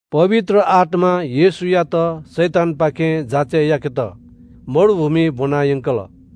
पवित्र आत्‍मां येशूयात शैतानपाखें जाँचय् याकेत मरुभूमिइ ब्‍वनायंकल।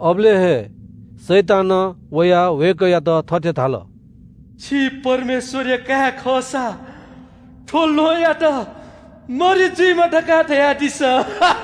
अबलय् हे शैतानं वयाः वय्‌कःयात थथे धाल – “छि परमेश्‍वरया काय् खःसा थ्‍व ल्‍वहंयात मरि जुइमा धकाः धयादिसँ।”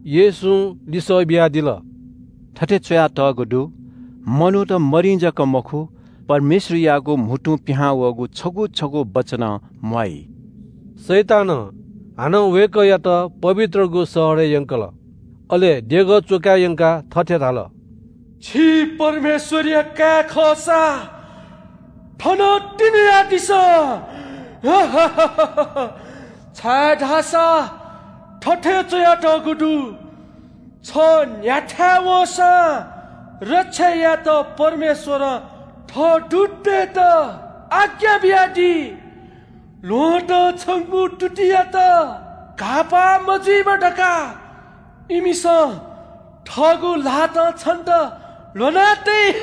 येशूं लिसः बियादिल – “थथे च्‍वयातःगु दु – “‘मनूत मरिं जक मखु, परमेश्‍वरयागु म्‍हुतुं पिहां वःगु छगू छगू वचनं म्‍वाइ।’” शैतानं हानं वय्‌कःयात पवित्रगु शहरय् यंकल, अले देगः च्‍वकाय् यंकाः थथे धाल – “छि परमेश्‍वरया काय् खःसा थनं तिंन्‍हुयादिसँ। छाय्‌धाःसा थथे च्‍वयातःगु दु – “‘छ न्‍ह्याथाय् वंसां रक्षा यायेत परमेश्‍वरं थः दूततय्‌त आज्ञा बियादी ल्‍वहँतं छंगु तुतियात घाःपाः मजुइमा धकाः इमिसं थःगु ल्‍हातं छन्‍त ल्‍ह्वना तइ।’”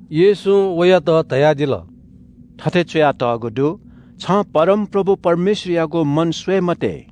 येशूं वयात धयादिल – “थथे च्‍वयातःगु दु – ‘छं परमप्रभु परमेश्‍वरयागु मन स्‍वये मते।’”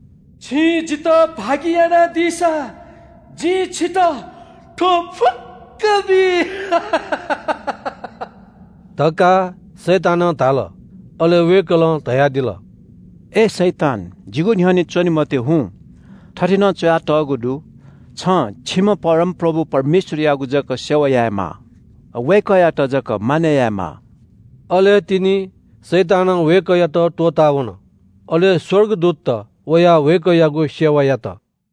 “छिं जितः भागि यानादीसा जिं छितः थ्‍व फुक्‍कं बी” धकाः शैतानं धाल। अले वय्‌कलं धयादिल – “अय् शैतान, जिगु न्‍ह्यःने च्‍वने मते, हुँ। थथे नं च्‍वयातःगु दु – “‘छं छिम्‍ह परमप्रभु परमेश्‍वरयागु जक सेवा यायेमाः। वय्‌कःयात जक मानय् यायेमाः।’” अले तिनि शैतानं वय्‌कःयात त्‍वःतावन। अले स्‍वर्गदूतत वयाः वय्‌कःयागु सेवा यात।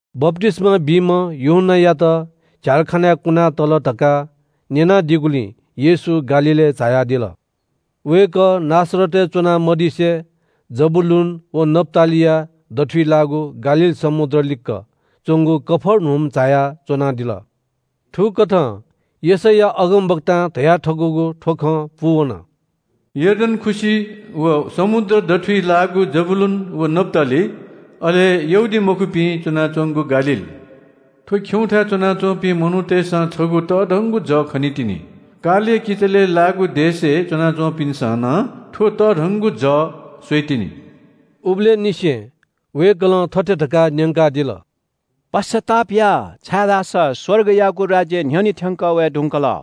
बप्‍तिस्‍मा बीम्‍ह यूहन्‍नायात झ्‍यालखानाय् कुनातल धकाः न्‍यनादीगुलिं येशू गालीलय् झायादिल। वय्‌कः नासरतय् च्‍वना मदिसे जबूलून व नप्‍तालीया दथुइ लाःगु गालील समुद्र लिक्‍क च्‍वंगु कफर्नहुम झायाः च्‍वनादिल। थुकथं यशैया अगमवक्तां धयाथकूगु थ्‍व खँ पूवन – “यर्दन खुसि व समुद्र दथुइ लाःगु जबूलून व नप्‍ताली, अले यहूदीमखुपिं च्‍वनाच्‍वंगु गालील, थ्‍व खिउँथाय् च्‍वनाच्‍वंपिं मनूतय्‌सं छगू तःधंगु जः खनीतिनि। कालया किचलय् लाःगु देशय् च्‍वनाच्‍वंपिन्‍सं नं थ्‍व तःधंगु जः स्‍वइतिनि।” उबलय् निसें वय्‌कलं थथे धकाः न्‍यंकादिल – “पश्‍चाताप या, छाय्‌धाःसा स्‍वर्गयागु राज्‍य न्‍ह्यःने थ्‍यंकः वये धुंकल।”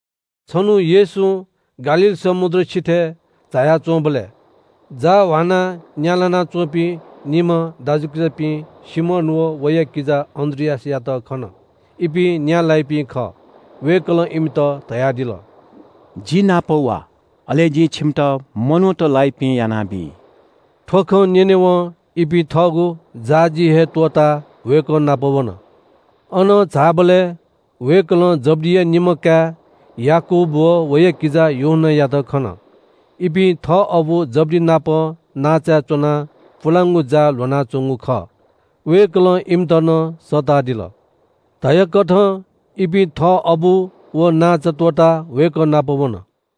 छन्‍हु येशूं गालील समुद्र सिथय् झाया च्‍वंबलय् जाः ह्वानाः न्‍या लानाच्‍वंपिं निम्‍ह दाजुकिजापिं सिमोन व वया किजा अन्‍द्रियासयात खन। इपिं न्‍या लाइपिं खः। वय्‌कलं इमित धयादिल – “जि नाप वा, अले जिं छिमित मनूत लाइपिं यानाबी।” थ्‍व खँ न्‍यनेवं इपिं थःगु जाःजी हे त्‍वःताः वय्‌कः नाप वन। अनं झाःबलय् वय्‌कलं जब्‍दिया निम्‍ह काय् याकूब व वया किजा यूहन्‍नायात खन। इपिं थः अबु जब्‍दि नाप नांचाय् च्‍वनाः पुलांगु जाः ल्‍ह्वनाच्‍वंगु खः। वय्‌कलं इमित नं सःतादिल। धयाकथं इपिं थः अबु व नांचा त्‍वःताः वय्‌कः नाप वन।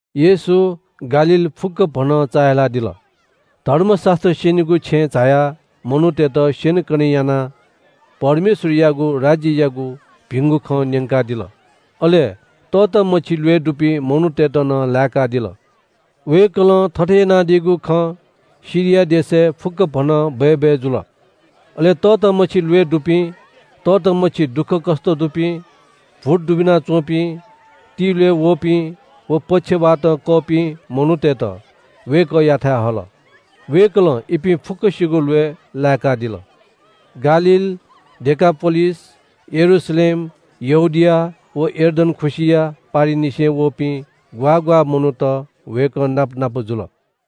येशू गालील फुक्‍कभनं चाःहिलादिल। धर्मशास्‍त्र स्‍यनीगु छेँय् झायाः मनूतय्‌त स्‍यनेकने यानाः परमेश्‍वरयागु राज्‍ययागु भिंगु खँ न्‍यंकादिल। अले तःतामछि ल्‍वय् दुपिं मनूतय्‌त नं लाय्‌कादिल। वय्‌कलं थथे यानादीगु खँ सिरिया देशय् फुक्‍कभनं बय्‌बय् जुल। अले तःतामछि ल्‍वय् दुपिं, तःतामछि दुःखकष्‍ट दुपिं, भूत दुबिना च्‍वंपिं, तिल्‍वय् वःपिं व पक्षवातं कःपिं मनूतय्‌त वय्‌कःयाथाय् हल। वय्‌कलं इपिं फुक्‍कसिगु ल्‍वय् लाय्‌कादिल। गालील, डेकापोलिस, यरूशलेम, यहूदिया व यर्दन खुसिया पारिंनिसें वःपिं ग्‍वाः ग्‍वाः मनूत वय्‌कः नाप नाप जुल।